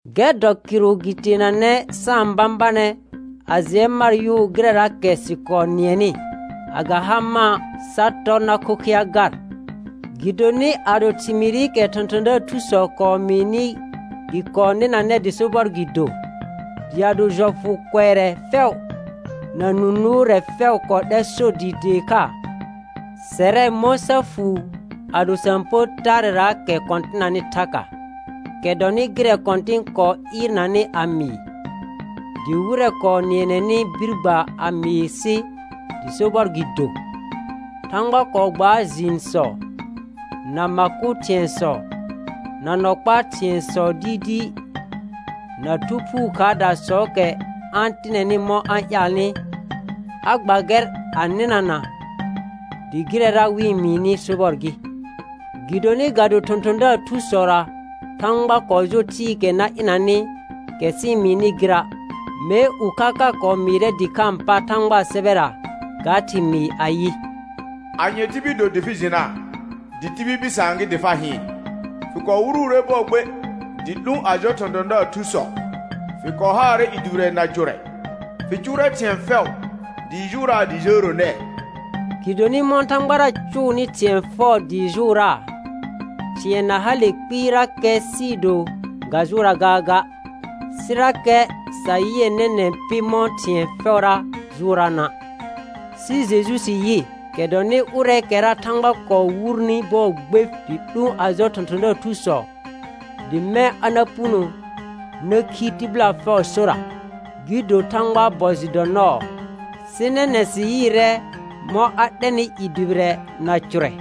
Gɛr dɔ kɩrʋ gɩ teenanɛ sa-n bãbanɛ a jɩɛ mar yʋʋ gɩrɛraakɛ sɩ kɔɔ nɩɛnɩ, a ga ha mã', sa tɔr na khokhɩa gar. Gɩdonɩ ado thɩmɩɩrɩkɛ thɔ̃thɔ̃daar thusɔ kɔɔ mɩɩnɩ gɩ kɔɔ nɩnanɛ dɩ sobɔr gɩ do, dɩ ado jɔfʋ kʋɛrɛ fɛʋ na nũ nʋʋrɛ fɛʋ kɔɔ 'lɛr sor dɩɩ tee kha, sɛrɛ mɔ̃ sa fuu ado sa-n pər taarɛraakɛ kɔ̃tɩnanɩ thaka? Kɛ dɔnɩ gɩrɛ Kɔ̃tɩn kɔɔ ɩɩrnanɩ a mɩɩ, dɩ wɩrɛ kɔɔ nɩɛnɛnɩ bir gba a mɩɩ sɩ dɩ sobɔr gɩ do. Thãgba kɔɔ gbaar jɩɩnsɔ, na ma kʋ thɩ̃ɛsɔ, na nɔ kpaa thɩ̃ɛsɔ dɩɩdɩɩ, na Thu Phuu khaardasɔɔkɛ a-n tɩnɛnɩ mɔ̃ a-n ƴaalnɩ, a gba gɛr a nɩnana dɩ gɩrɛra wɩ-n mɩɩnɩ sobɔr gɩ. Gɩdonɩ ga do thɔ̃thɔ̃daar thusɔra Thãgba kɔɔ jo thɩɩkɛ na ɩnanɩ, kɛ sɩ-n mɩɩnɩ gɩra'. Mee ʋkha ka kɔɔ mɩɩrɛ dɩkhãa pa Thãgbaa sɛbɛra ga thɩmɩɩ ayɩ: «Anye tibil do dɩ fɩ jɩnaa dɩ tibil bɩsaan gɩ dɩ fa hɩɩn? Fɩ kɔɔ wuruure bɔɔ gbe dɩ 'lũ a jɔ thɔ̃thɔ̃daar thusɔ. Fɩ kɔɔ haarɛ i dʋbɩrɛ na cʋrɛ. Fɩ cʋʋrɛ thɩ̃ɛ fɛʋ dɩɩ jʋʋraa dɩ jəəro nɛɛ.» Gɩdonɩ mɔ̃ Thãgbara cʋʋnɩ thɩ̃ɛ fɛʋ dɩɩ jʋʋraa, thɩ̃ɛ na hale kpɩɩrakɛ sɩɩ do ga jʋʋraa gaaga. Sɩrakɛ sa yɩɛ nɛnɛ̃ pɩ mɔ̃ thɩ̃ɛ fɛʋra jʋʋraana'. Sɩ Jeju sɩ yɩ, kɛ dɔnɩ ʋrɛɛkɛra Thãgba kɔɔ wurni bɔɔ gbe dɩ 'lũ a jɔ thɔ̃thɔ̃daar thusɔ, dɩ mɛ̃ a na puno na khi tɩbɩla fɛʋʋ sora, gɩ do Thãgbaa bɔ jɩ dɔ nɔɔ, sɩ nɛnɛ̃ sɩ yɩɩrɛ mɔ̃ a 'lɛnɩ i dʋbɩrɛ na cʋrɛ,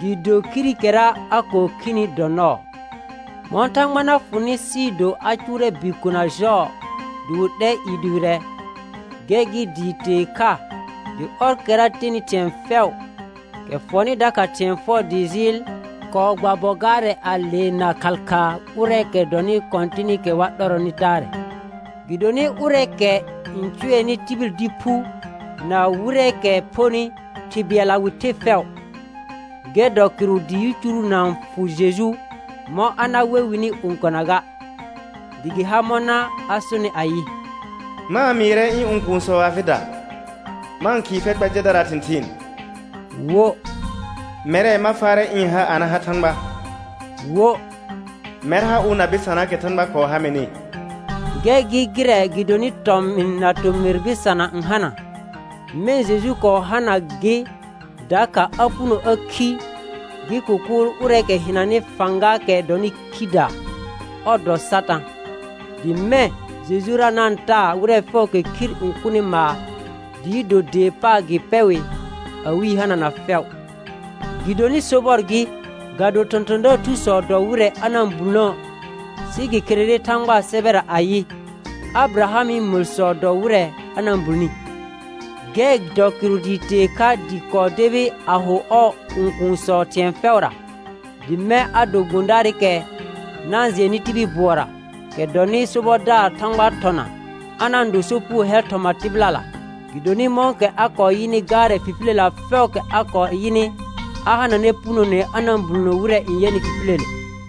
dɩɩ do khirikɛra a kɔɔ khini dɔ nɔɔ. Mɔ̃ Thãgba na fʋnɩ sɩɩ do a cʋʋrɛ bikona jɔɔ dɩ wɩ 'lɛ i dʋbɩrɛ, gɛr gɩ dɩɩ tee kha dɩ ɔrkɛra tenɩ thɩ̃ɛ fɛʋ, kɛ fɔnɩ dakha thɩ̃ɛ fɛʋ dɩɩ jɩɩl, kɔɔ gba bɔ gaarɛ a leena khal khaa ʋrɛɛkɛ dɔnɩ kɔ̃tɩnɩkɛ wa 'lɛrɔnɩ taarɛ. Gɩdonɩ ʋrɛɛkɛ n cʋɛnɩ tibil dɩ phu, na wɩrɛɛkɛ phonɩ, Thɩ bɩɛlla wɩ the fɛʋ, gɛr dɔ kɩrʋ dɩ yicuru na-n fʋ Jeju mɔ̃ a na we wɩnɩ õkona ga. Dɩ gɩ har mɔna a sonɩ ayɩ: «Ma-n mɩɩrɛ ɩ̃ õkuunsɔ afɩda, ma-n khɩɩ fɛr kpa jɛdaraa thɩ̃thɩɩn.» Wo: «Mɛrɛ ma faarɛ ɩ̃ ha a na ha Thãgba.» Wo: «Mɛr ha ʋ na bɩsanaakɛ Thãgba kɔɔ ha mɩnɩ.» Gɛr gɩ gɩrɛ gɩdonɩ tɔmɩn na tomɩr bɩsana n hana, mɛ̃ Jeju kɔɔ hana gɩ dakha a puno a khi gɩ kʋkʋʋl ʋrɛ hɩnanɩ fãgaakɛ dɔnɩ khidaa, ɔr dɔ Satã; dɩ mɛ̃ Jejura na-n taa wɩrɛ fɛʋʋkɛ khir n kʋnɩ maar dɩɩ do dee paar gɩ pɛ wɩ awɩ yi hanana fɛʋ. Gɩdonɩ sobɔr gɩ, ga do thɔ̃thɔ̃daar thusɔ dɔ wɩrɛ a na-n bulnə', sɩ gɩ kherere Thãgbaa sɛbɛra ayɩ: «Abɩrahamɩ məlsɔ dɔ wɩrɛ a na-n bulni.» Gɛr dɔ kɩrʋ dɩɩ tee kha dɩ kɔɔ debi a ho ɔɔ õkuunsɔ thɩ̃ɛ fɛʋra, dɩ mɛ̃ a do gbõdaarɩkɛ na-n jɩɛnnɩ tibil bʋɔra, kɛ dɔnɩ sobɔdaar Thãgbaa thɔna, a na-n do sopugo hɛl thɔma tɩbɩlala. Gɩdonɩ mɔ̃kɛ a kɔɔ yɩnɩ gaarɛ fifiləlela fɛʋʋkɛ a kɔɔ yɩnɩ, a hananɛ punone a na-n bulnə wɩrɛ n yɛnɩ fifiləle.